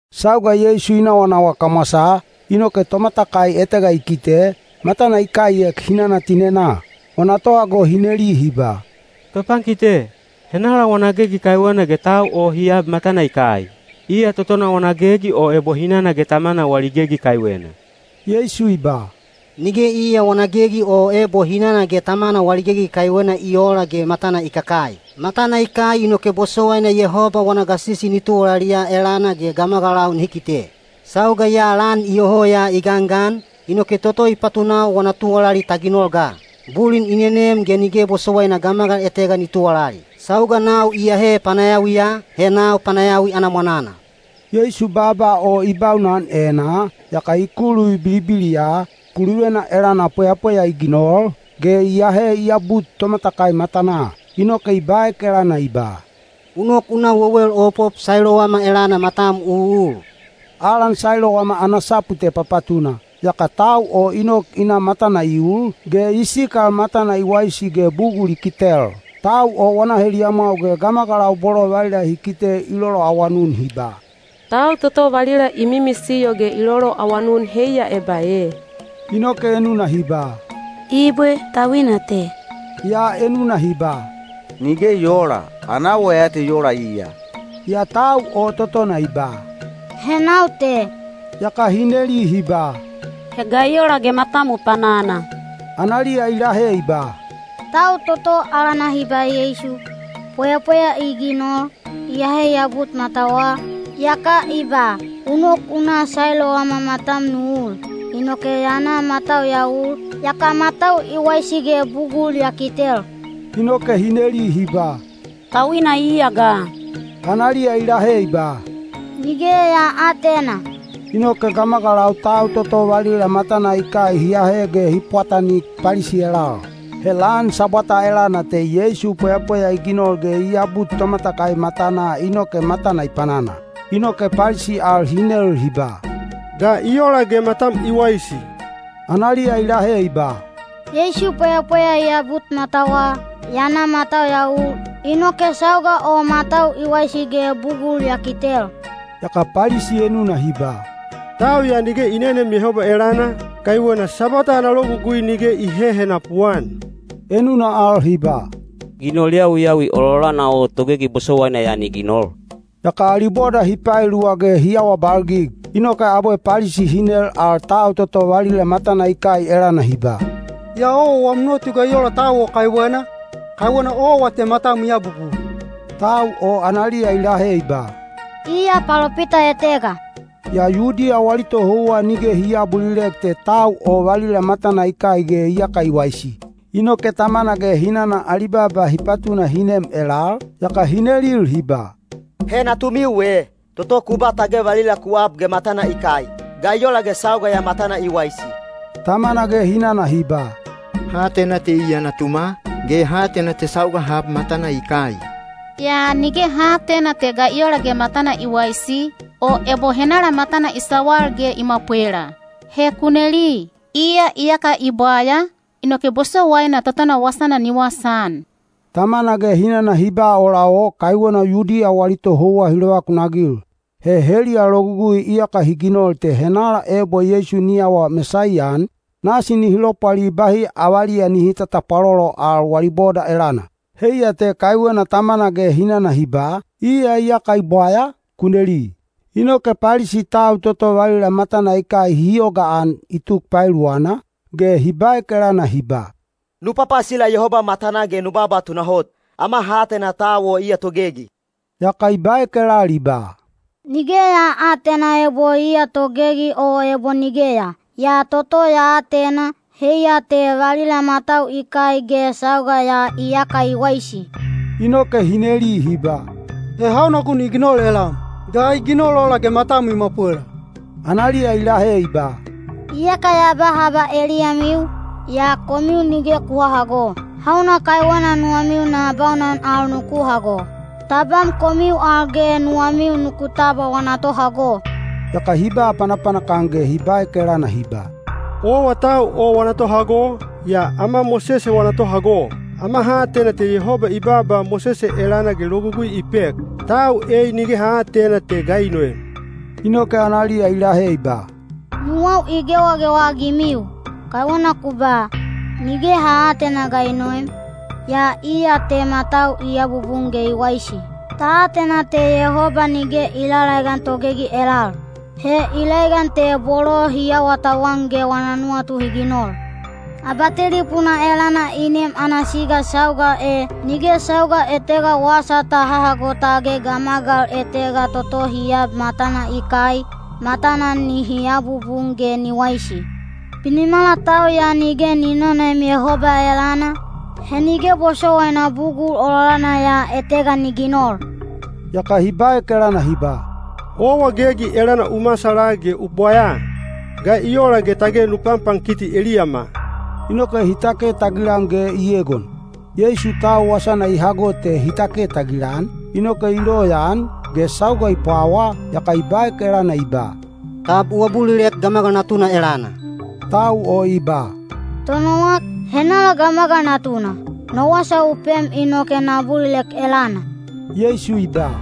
Sauga Yeisu i nawanawa kamwasaa, inoke tomatakai etega i kite, matana i kaiek hinana tinenaa. Wana tohago hi neli hi ba, “Topankite, henala wana gegi kaiwena ge tau o hi ab matana i kai? Iya totona wana gegi o ebo hinana ge tamana wali gegi kaiwena?” Yeisu i ba, “Nige iya wana gegi o ebo hinana ge tamana wali gegi kaiwena i oola ge matana i kakai. Matana i kai inoke bosowaina Yehoba wana gasisi ni tuwalaliya elana ge gamagalau nihi kite. Sauga ya lan iyoho ya i gangan, inoke toto i patunau wana tuwalali ta ginol ga. Bulin i nenem ge nige bosowaina gamagal etega ni tuwalali. Sauga nau iyahe panayawiya, he nau panayawi ana mwananal.” Yeisu baaba o i baunan enaa, yaka i kuluvi bilibiliya, kuluvena elana pweyapweya i ginol, ge i ahe i abut tomatakai matanaa. Inoke i baek elana i ba, “U nok u na wewel opop Sailowama elana matam u ul.” (Alan Sailowama ana sapu te Papatuna.) Yaka tau o i nok i na matana i ul, ge i sikal matana i waisi ge bugul i kitel. Tau o wana heliyamwau ge gamagalau bolo valila hi kite i loloawanun hi ba, “Tau toto valila i mimisiyo ge i loloawanun heiya eba e?” Inoke enuna hi ba, “Ibwe, tauina te.” Yaa enuna hi ba, “Nige i oola. Ana awa ya te i ola iya.” Yaa tau o totona i ba, “He nau te.” Yaka hi neli hi ba, “He ga i ola ge matam u panana?” Analiya i lahe i ba, “Tau toto alana hi ba Yeisu, pweyapweya i ginol, i ahe i abut matawa, yaka i ba, ‘U nok u na Sailowama matam nu ul.’ Inoke ya na matau ya ul, yaka matau i waisi ge bugul ya kitel.” Inoke hi neli hi ba, “Tauina iya ga?” Analiya i lahe i ba, “Nige ya aatena.” Inoke gamagalau tau toto valila matana i kai hi ahe ge hi pwatanik Palisi elal. He lan Sabwata elana te Yeisu pweyapweya i ginol ge i abut tomatakai matanaa inoke matana i panana. Inoke Palisi al hi nel hi ba, “Ga i ola ge matam i waisi?” Analiya i lahe i ba, “YeisuoV pweyapweya i abut matawa, ya na matau ya ul, inoke sauga o matau i waisi ge bugul ya kitel.” Yaka Palisi enuna hi ba, “Tau ya nige i neneem Yehoba elana, kaiwena Sabwata ana logugui nige i hehenapu-an.” Enuna al hi ba, “Ginol yawiyawi ololana o togegi bosowaina ya ni ginol?” Yaka ali boda hi paeluwa ge hi awabalgig. Inoke abwe Palisi hi nel al tau toto valila matana i kai elana hi ba, “Yaa owa wam nuwatu ga i ola tau o kaiwena? Kaiwena owa te matam i abubun.” Tau o analiya i lahe i ba, “Iya palopita etega.” Yaa Yudiya wali tohouwa nige hi aabulilek te tau o valila matana i kai ge iyaka i waisi. Inoke tamana ge hinana ali baaba hi patuna hi nem elal, yaka hi nelil hi ba, “He natumiu e, toto ku ba tage valila ku ab ge matana i kai? Ga i ola ge sauga ya matana i waisi?” Tamana ge hinana hi ba, “Ha atena te iya natuma, ge ha atena te sauga ha ab matana i kai. Yaa nige ha aatena te ga i ola ge matana i waisi, o ebo henala matana i sawal ge i mwapwela. He ku neli; iya iyaka i bwaya, inoke bosowaina totona wasana ni wasaan.” Tamana ge hinana hi ba ola o kaiwena Yudiya wali tohouwa hi lovakunagil. He heliya logugui iyaka hi ginol te henala ebo Yeisu ni awa Mesaiya-an, nasi nihi lopwali bahi avaliya nihi tatapwalolo al wali boda elana. Heiya te kaiwena tamana ge hinana hi ba, “Iya iyaka i bwaya; ku neli.” Inoke Palisi tau toto valila matana i kai hi yogaan i tuk paeluwana, ge hi baek elana hi ba, “Nu papasila Yehoba matanaa ge nu baaba tunahot! Ama ha atena tau o iya togegi.” Yaka i baek elal i ba, “Nige ya aatena ebo iya togegi o ebo nigeya. Yaa toto ya atena, heiya te valila matau i kai ge sauga ya iyaka i waisi!” Inoke hi neli hi ba, “He hauna gun i ginol elam? Ga i ginol ola ge matam i mwapwela?” Analiya i lahe i ba, “Iyaka ya ba haba eliyamiu, yaa komiu nige ku hahago. Hauna kaiwena nuwamiu na baunan al nuku hago? Tabam komiu al ge nuwamiu nuku tabwa wana tohago.” Yaka hi ba panapanak-an ge hi baek elana hi ba, “Owa tau o wana tohago, yaa ama Mosese wana tohago. Ama ha atena te Yehoba i baaba Mosese elana ge logugui i pek. Tau ei nige ha aatena te ga i noem!” Inoke analiya i lahe i ba, “Nuwau i gewagewa-agimiu! Kaiwena ku ba, ‘Nige ha aatena ga i noem,’ yaa iya te matau i abubun ge i waisi. Ta atena te Yehoba nige i lalaegan togegi elal. He i laegan te bolo hi awatauwan ge wana nuwatu hi ginol. Abatelipuna elana i nem ana siga sauga e, nige sauga etega wasa ta hahago tage gamagal etega toto hi ab matana i kai, matana nihi abubun ge ni waisi. Binimala tau ya nige ni nonoem Yehoba elana, he nige bosowaina bugul ololana ya etega ni ginol.” Yaka hi baek elana hi ba, “Owa gegi elana u masala ge u bwayaa! Ga i ola ge tage nu panpankiti eliyama?” Inoke hi take tagilan ge i egon. Yeisu tau wasana i hago te hi take tagilan, inoke i loyaan, ge sauga i pwawa, yaka i baek elana i ba, “Tab u abulilek Gamagal Natuna elana?” Tau o i ba, “Tonowak, henala Gamagal Natuna? No wasa u pem inoke na abulilek elana.” Yeisu i ba,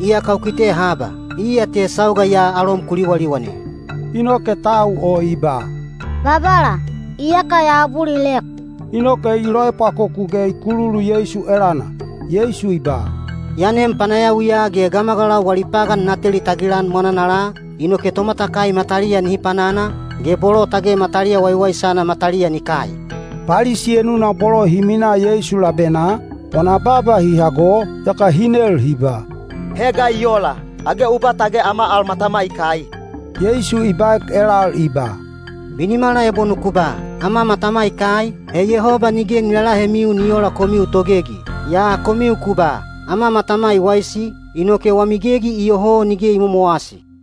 “Iyaka u kite haba; iya te sauga ya alom ku liwaliwan e.” Inoke tau o i ba, “Babala, iyaka ya abulilek.” Inoke i loepwakoku ge i kululu Yeisu elana. Yeisu i ba, “Ya nem panayawiya ge gamagalau wali pagan na teli tagilan mwananala, inoke tomatakai mataliya nihi panana, ge bolo tage mataliya waiwaisana mataliya ni kai.” Palisi enuna bolo hi minaa Yeisu labenaa, wana baaba hi hago, yaka hi nel hi ba, “He ga i ola? Age u ba tage ama al matama i kai?” Yeisu i baek elal i ba, “Binimala ebo nuku ba, ‘Ama matama i kai,’ he Yehoba nige ni lalahemiu ni oola komiu togegi. Yaa komiu ku ba, ‘Ama matama i waisi,’ inoke wami gegi iyoho nige i momowasi.”